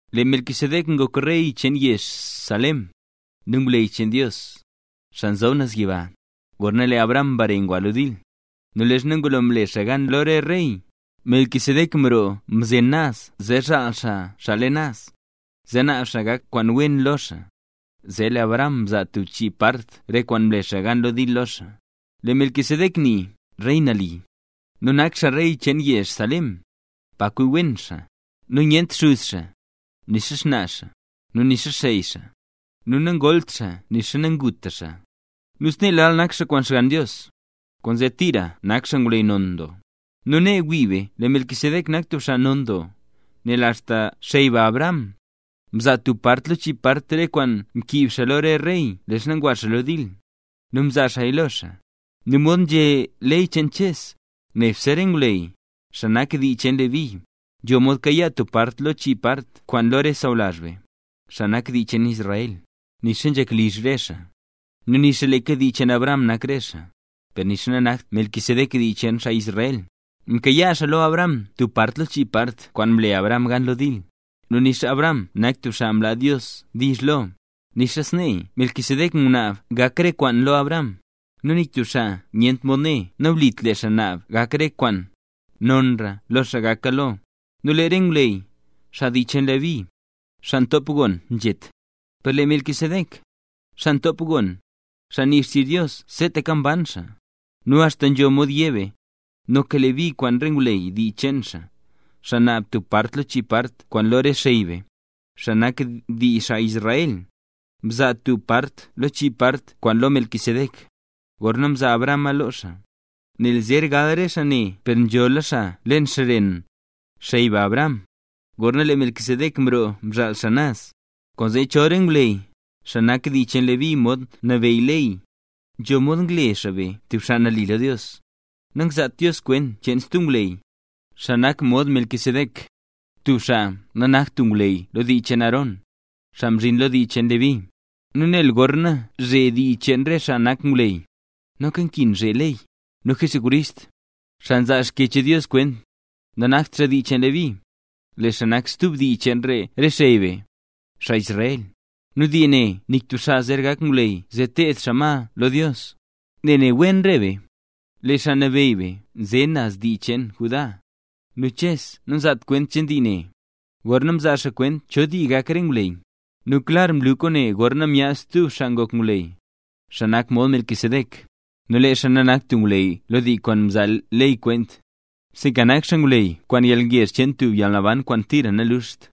Lee Melquisedec ngok rey cheen yezh Salem, nu ngwleyy cheen Dios, xaa nzob naz yiba. Gorna lee Abraham mbare ngwa lo dil, nu leezha ngulo mle xaa gan lo re rey, Melquisedec mroo mzen naz zee zhaal xaa xaa leen naz, zee naab xaa gak kwaan wen lo xaa; zee lee Abraham mzaa tub chii part re kwaan mle xaa gan lo dil lo xaa. Lee le Melquisedec nii “rey nali”; nu nak xaa rey cheen yezh Salem, pa kwi wen xaa. Nu nyent xuz xaa, nixa xnaa xaa, nu nixa xey xaa, nu nangolt xaa nixa nanguta xaa; nu snee lal nak xaa kwaan Xgann Dios, kwaanzee tira nak xaa ngwleyy non doo. ¡Nu nee wii be lee Melquisedec nak tub xaa non doo, nel axta xey be Abraham, mzaa tub part lo chii part re kwaan mkiib xaa lo re rey leezha ngwa xaa lo dil, nu mzaa xaaya lo xaa! Nu mod nzhé ley cheen Ches, nebse re ngwleyy, xaa nak dii cheen Leví, nzho mod kayaa tub part lo chii part kwaan lo re sawlazh be, xaa nak dii cheen Israel, nixa nzhak sawlizh re xaa, nu nixa leeka dii cheen Abraham nak re xaa. Per nixa nanakt Melquisedec dii cheen xaa Israel, mkayaa xaa lo Abraham tub part lo chii part kwaan mle Abraham gan lo dil. ¡Nu nixa Abraham nak tub xaa mlaa Dios diizh lo, nixa sneeya Melquisedec ngunaab gak re kwaan lo Abraham! Nu nik tub xaa nyent mod né nawlit, lee xaa naab gak re kwaan, nonra lo xaa gaka lo. Nu lee re ngwleyy, xaa dii cheen Leví, xaa ntop gon nzhet, per lee Melquisedec, xaa mtop gon, xaa nii xtizh Dios seetaka mban xaa. Nu axta nzho mod yé be, noka Leví kwaan re ngwleyy dii cheen xaa, xaa naab tub part lo chii part kwaan lo re xey be, xaa nak dii xaa Israel, mzaa tub part lo chii part kwaan lo Melquisedec, gorna mzaa Abrahama lo xaa; nel zer gal re xaa ne per nzhola xaa leen xren xey be Abraham, gorna lee Melquisedec mroo mzhaal xaa naz. Kwaanzee chol re ngwleyy, xaa nak dii cheen Leví mod nabeyy ley, nzho mod ngle xaa be tub xaa nali lo Dios, nangzaat Dios kwent cheen stub ngwleyy, xaa nak mod Melquisedec, tub xaa nanakt tub ngwleyy lo dii cheen Aarón, xaa mzhin lo dii cheen Leví. Nu nel gorna nzhee dii cheen re xaa nak ngwleyy, noka nkin zhee ley. Nu Jesucrist, xaa nzaa Xkyech Dios kwent, nanakt xaa dii cheen Leví; lee xaa nak stub dii cheen re xey be, xaa Israel. Nu dii ne nik tub xaa zer gak ngwleyy zee teed xaa ma lo Dios. Nel ne wen re be, lee Xaa Nabeyy be nze naz dii cheen Judá, nu Ches namzaat kwent cheen dii ne, gorna mzaa xaa kwent cho dii gak re ngwleyy. Nu klar mlu kwaane gorna myaad stub xaa ngok ngwleyy, xaa nak mod Melquisedec. Nu lee xaa nanakt tub ngwleyy lo dii kwaan nzaa ley kwent, sinka nak xaa ngwleyy kwaan yalngezh cheen tub yalnaban kwaan tira nanluxt.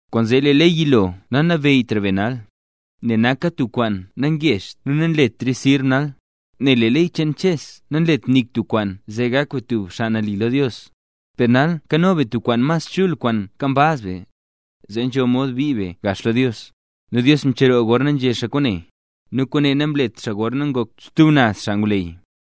Kwaanzee lee ley yilo nanabeyytra be nal, nel naka tub kwaan nangezht nu nanletraya sirb nal, nel lee ley cheen Ches namlet nik tub kwaan zee gak be tub xaa nali lo Dios. Per nal nkano be tub kwaan mas chul kwaan nkambaz be, zee nzho mod bii be gax lo Dios. Nu Dios mcheroo gorna nzhé xaa kwaane. Nu kwaane namlet xaa gorna ngok stub naz xaa ngwleyy,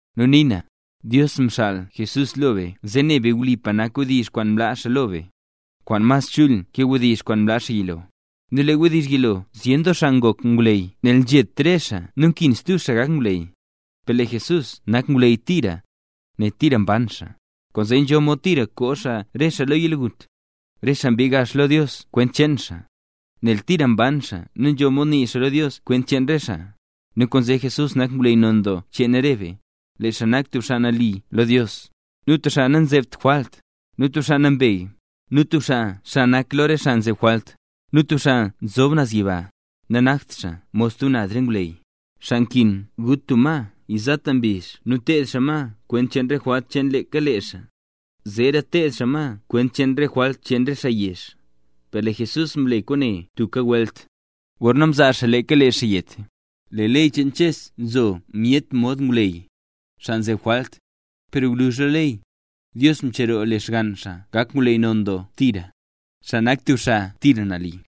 Nu nii na, Dios mxaal Jesús lo be zee ne be wlipa nak wdizh kwaan mlaa xaa lo be, kwaan mas chul ke wdizh kwaan mlaa xaa yilo. Nu lee wdizh yilo zyen doo xaa ngok ngwleyy nel nzhet re xaa nu nkin stub xaa gak ngwleyy, per lee Jesús nak ngwleyy tira, nel tira mban xaa. Kwaanzee nzho mod tira koo xaa re xaa lo yalgut, re xaa mbii gax lo Dios kwent cheen xaa, nel tira mban xaa nu nzho mod nii xaa lo Dios kwent cheen re xaa. Nu kwaanzee Jesús nak ngwleyy non doo cheen re be. Lee xaa nak tub xaa nali lo Dios, nu tub xaa nanzebt jwalt, nu tub xaa nambey, nu tub xaa xa nak lo re xaa nzeb jwalt, nu tub xaa nzob naz yiba. Nanakt xaa mod stub naz re ngwleyy, xaa nkin gut tub ma yizata mbizh nu teed xaa ma kwent cheen re jwalt cheen leeka lee xaa, zeera teed xaa ma kwent cheen re jwalt cheen re xaa yezh, per lee Jesús mle kwaane tubka welt, gorna mzaa xaa leeka lee xaa yet. Lee ley cheen Ches nzo myet mod ngwleyy, xaa nzeb jwalt; per gwluzh lo ley, Dios mcheroo lee Xgann xaa gak ngwleyy non doo tira, xaa nak tub xaa tira nali.